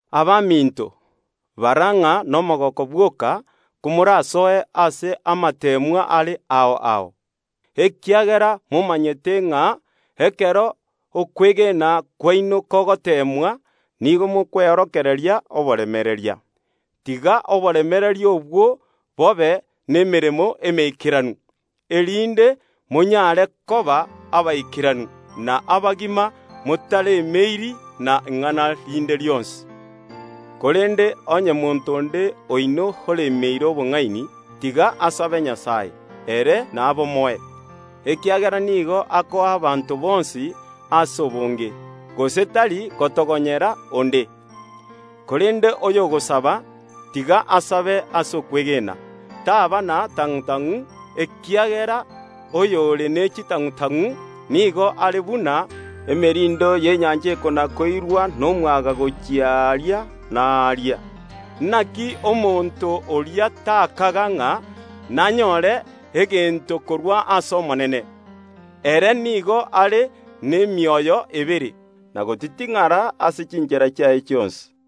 Abaminto, bara ng’a nomogooko bwoka komorasoe ase amateemwa are ao ao, ekiagera momanyete ng’a ekero okwegena kwaino kogoteemwa nigo mokweorokereria oboremereria. Tiga oboremereria obwo bobe nemeremo emeikeranu, erinde monyare koba abaikeranu, na abagima, motaremeiri na ing’ana rinde rionsi. Korende onye monto onde oino oremeire obong’aini, tiga asabe Nyasae, ere nabomoe, ekiagera nigo akoa abanto bonsi ase obonge, gose tari gotogonyera onde. Korende oyogosaba, tiga asabe ase okwegena, taba na tang’u‐tang’u, ekiagera oyore ne chitang’u‐tang’u nigo are buna emerindo y’enyancha ekona‐koirwa nomwaga gochia aaria na aaria. Naki omonto oria takaga ng’a nanyore egento korwa ase Omonene; ere nigo are nemioyo ebere, na gotiting’ara ase chinchera chiaye chionsi.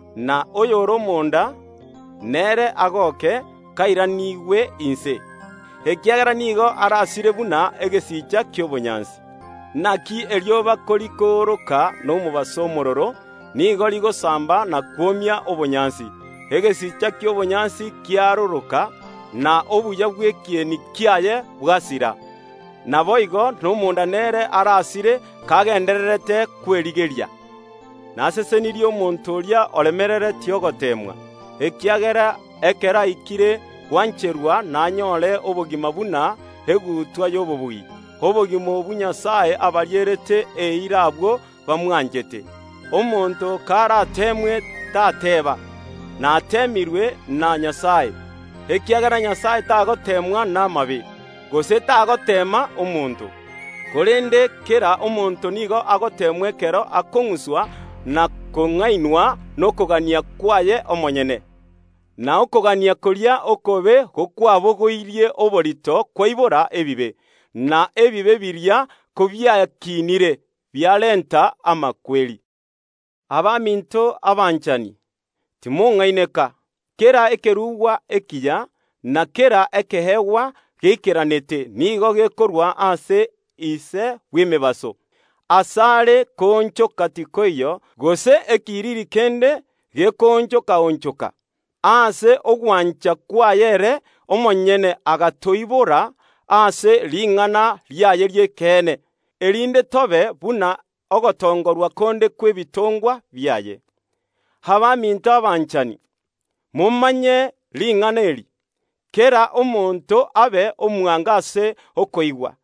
na abakristo abanda, nabarabwo bagoke kobairanigwe inse, ekiagera nigo barasire buna egesicha ki’obonyansi. Naki erioba korikooroka nomobaso omoororo, nigo rigosamba na kwomia obonyansi. Egesicha ki’obonyansi kiaroroka, na obuya bw’ekieni kiaye bwasira. Naboigo nomonda nere arasire kagendererete kwerigeria. Nasesenirie omonto oria oremereretie ogoteemwa, ekiagera ekero aikire gwancherwa nanyore obogima buna egutwa y’obobui, obogima obwo Nyasae abarierete eira abwo bamwanchete. Omonto karateemwe, tateeba “Nateemirwe na Nyasae” ekiagera Nyasae tagoteemwa namabe, gose tagoteema omonto. Korende kera omonto nigo agoteemwa ekero akong’uswa na kong’ainwa nokogania kwaye omonyene. Na okogania koria okobe gokwabogoirie oborito kwaibora ebibe, na ebibe biria kobiakiinire, biarenta amakweri. Abaminto abanchani, timong’aineka. Kera ekerugwa ekiya, na kera ekeegwa geikeranete nigo gekorwa ase Ise bw’emebaso. Asare koonchoka tikoiyo, gose ekiriri kende gekooncha‐onchoka. Ase ogwancha kwaye ere omonyene agatoibora ase ring’ana riaye ri’ekeene, erinde tobe buna ogotongorwa konde kw’ebitongwa biaye. Abaminto abanchani, momanye ring’ana eri: Kera omonto abe omwango ase okoigwa,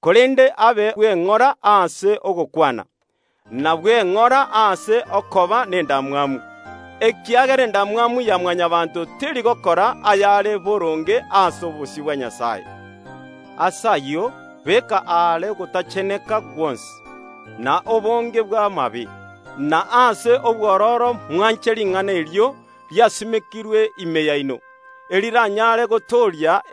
korende abe bwe ng’ora ase ogokwana, na bwe ng’ora ase okoba nendamwamu, ekiagera endamwamu ya Mwanyabaanto teri gokora ayare boronge ase obosio bwa Nyasae. Ase ayio, beka aare ogotacheneka gwonsi, na obonge bw’amabe, na ase obwororo mwanche ring’ana erio riasimekirwe ime yaino, eriranyare kobatooria.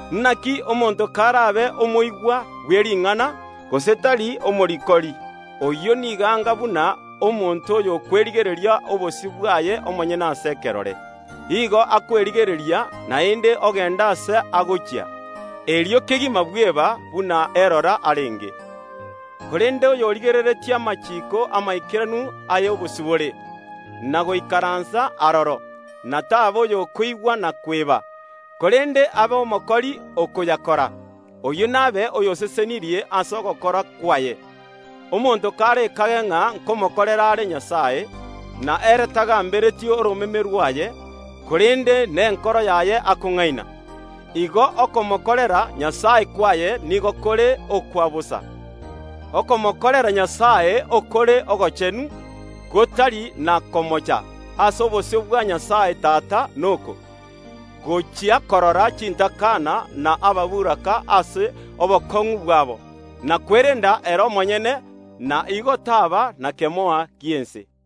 Naki omonto karabe omotegereri bw’ering’ana, gose tari omorikori, oyio nigo anga buna omonto oyokwerigereria obosio bwaye omonyene ase ekerore. Igo akwerigereria, naende ogenda ase agochia, erio kegima bweba buna erora arenge. Korende oyorigereretie amachiiko amaikeranu ay’obosibore, na goikaransa aroro, na taba oyokoigwa na kweba, korende abe omokori okoyakora, oyio nabe oyosesenirie ase ogokora kwaye. Omonto karekage ng’a nkomokorera are Nyasae, na ere tagambereti oromeme rwaye, korende nenkoro yaye akong’aina, igo okomokorera Nyasae kwaye nigo kore okwa bosa. Okomokorera Nyasae okore ogochenu, gotari na komocha ase obosio bwa Nyasae Tata noko: Gochia korora chintakana na ababoraka ase obokong’u bwabo, na kwerenda ere omonyene, na igo taba na kemoa gi’ense.